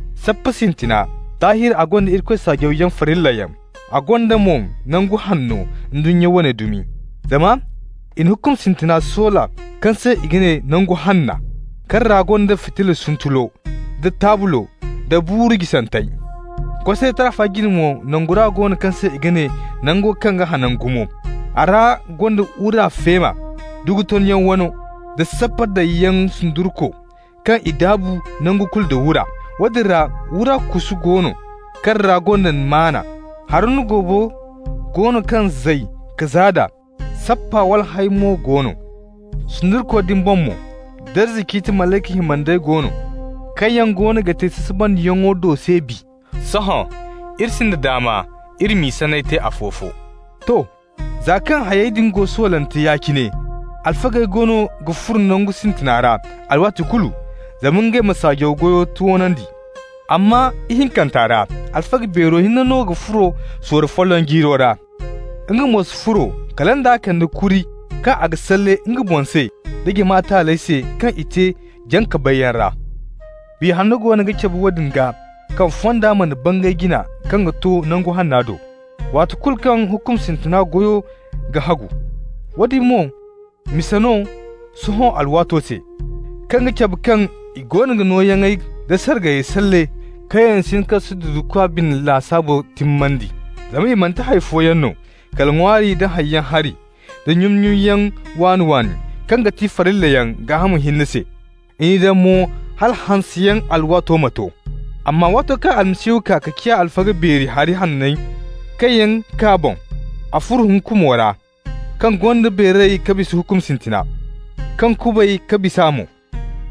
Sappa sintina, daahir a gonda Irikoy saajaw goy farillayaŋ, a gonda mo nangu hanno, ndunnya wane dumi. Zama i na hukum sintina soola kaŋ se i ga ne Nangu Hanna, kaŋ ra gonda fitilla suntulo, da taablo, da buuru jisantey. Kosaray taafa jine mo, Nangora go no kaŋ se i ga ne Nango kaŋ ga hanan gumo. A ra gonda wura feema, dugu tonyaŋ wano, da sappa daŋyaŋ sundurko kaŋ i daabu nangu kulu nda wura. Woodin ra wura kusu go no kaŋ ra gonda Manna, Haruna goobo go no kaŋ zay ka zaada, sappa walhẽy mo go no. Sundurko din boŋ mo darza ciiti malayka himandey go no, kaŋ yaŋ goono ga te sasabandiyaŋo do se bi. Sohõ iri sinda daama iri m'i sanney te afo-fo. To, za kaŋ hayey din go soolante ya-cine, alfagey goono ga furo nangu sintina ra alwaati kulu zama ngey ma saajaw goyo toonandi. Amma ihinkanta ra, alfaga beero hinne no ga furo sorro folloŋ jiiro ra. Nga mo si furo kala nd'a ga kande kuri kaŋ a ga salle nga bumbo se, da jama taaley se kaŋ i te jaŋ-ka-bayyaŋ ra. Biya Hanna goono ga cabe woodin gaa kaŋ fonda mana bangay jina kaŋ ga to Nangu Hanna do, waati kulu kaŋ hukum sintina goyo ga hagu. Woodin mo misa no sohõ alwaato se, kaŋ ga cabe kaŋ i goono ga nooyaŋey da sargayey salle kaŋ yaŋ si hin ka sududukwa bine lasaabo timmandi. Zama i manti hay fooyaŋ no kala ŋwaari da haŋyaŋ hari da nyun-nyunyaŋ waani-waani, kaŋ ga ti farillayaŋ gaaham hinne se. I n'i daŋ mo hala hanseyaŋ alwaato ma to. Amma waato kaŋ Almasihu kaa ka ciya alfaga beeri hari hanney kaŋ yaŋ kaa boŋ, a furo hukumo ra kaŋ gonda beeray ka bisa hukum sintina, kaŋ kubay ka bis'a mo.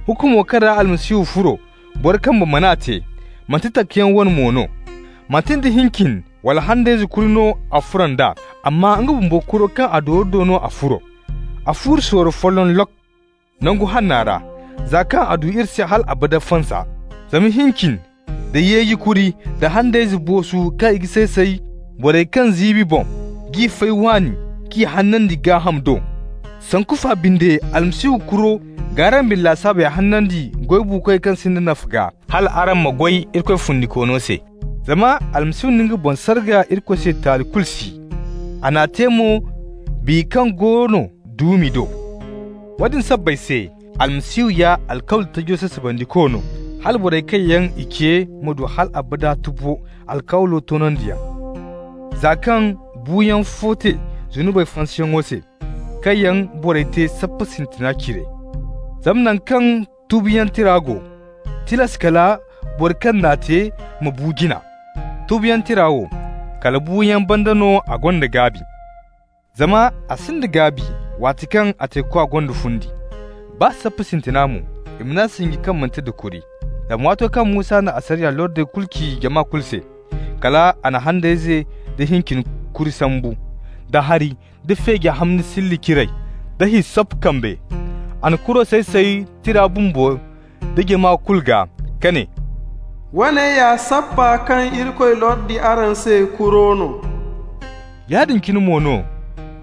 Hukumo kaŋ ra Almasihu furo, boro kambe man'a te, manti takayaŋ wo wane no. Manti nda hincin wala handayze kuri no a furo nd'a, amma nga bumbo kuro kaŋ a dooru do no a furo. A furo sorro folloŋ lok! Nangu Hanna ra, za kaŋ a du iri se hal abada fansa. Zama hincin da yeeji kuri, da handayze boosu kaŋ i ga say-say borey kaŋ ziibi boŋ g'i fay waani k'i hanandi gaaham do. Sanku fa binde Almasihu kuro g'araŋ bine lasaabey hanandi goy buukoy kaŋ sinda nafa gaa, hal araŋ ma goy Irikoy Fundikoono se. Zama Almasihu na nga boŋ sarga Irikoy se taali kulu si. A n'a te mo Biya kaŋ go no duumi do. Woodin sabbay se Almasihu ya alkawli tajo sasabandiko no, hala borey kaŋ yaŋ i ce ma du hal abada tubo alkawlo toonandiyaŋ, za kaŋ buuyaŋ fo te zunubey fansayaŋo se kaŋ yaŋ borey te sappa sintina cire. Zama naŋ kaŋ tubuyaŋ tira go, tilas kala boro kaŋ n'a te ma bu jina. Tubuyaŋ tira wo, kala buuyaŋ banda no a gonda gaabi, zama a sinda gaabi waati kaŋ a teekwa gonda fundi. Baa sappa sintina mo, i man'a sinji kaŋ manti nda kuri. Zama waato kaŋ Musa na asariya lordey kulu ci jama kulu se, kal a na handayze da hincin kuri sambu, da hari, da feeji hamni silli ciray, da hissop kambe. A na kuro say-say tira bumbo da jama kulu gaa, ka ne: «Woone ya sappa kaŋ Irikoy lordi araŋ se kuro no.» Yaadin cine mo no,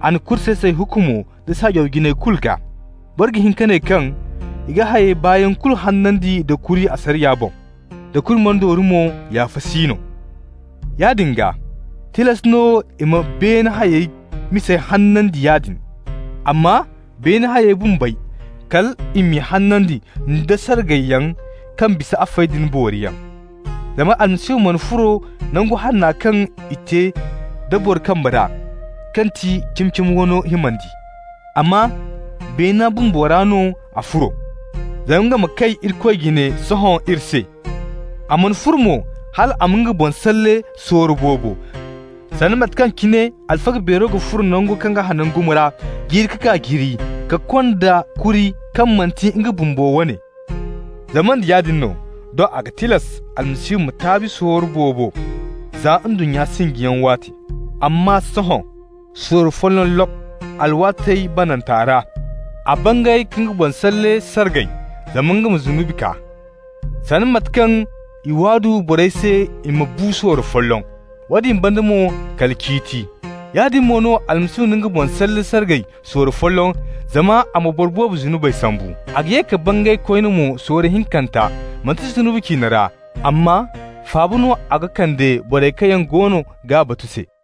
a na kuri say-say hukumo da saajaw jinayey kulu gaa. Boro ga hin ka ne kaŋ i ga hayey baayaŋ kulu hanandi nda kuri asariya boŋ. Da kuri mana dooru mo, yaafa si no. Yaadin gaa, tilas no i ma beene hayey misey hanandi yaadin. Amma beene hayey bumbey, kal i m'i hanandi nda sargayyaŋ kaŋ bisa afey din booriyaŋ. Zama Almasihu mana furo Nangu Hanna kaŋ i te da boro kambe ra, kaŋ ti cimi-cimo wano himandi. Amma beena bumbo ra no a furo, zama nga ma kay Irikoy jine sohõ iri se. A mana furo mo hal a ma nga boŋ salle sorro boobo, sanda mate kaŋ cine alfaga beero ga furo Nango kaŋ ga hanan gumo ra jiiri ka kaa jiiri ka konda kuri kaŋ manti nga bumbo wane. Zama nda yaadin no, doŋ a ga tilas Almasihu ma taabi sorro boobo za ndunnya sinjiyaŋ waate. Amma sohõ, sorro folloŋ lok! alwaatey bananta ra a bangay ka nga boŋ salle sargay zama nga ma zunubi kaa. Sanda mate kaŋ i waadu borey se i ma bu sorro folloŋ, woodin banda mo kala ciiti, yaadin mo no Almasihu na nga boŋ salle sargay sorro folloŋ zama a ma boro boobo zunubey sambu. A ga ye ka bangay koyne mo sorro hinkanta, manti zunubi ciine ra, amma faaba no a ga kande borey kaŋ yaŋ goono g'a batu se.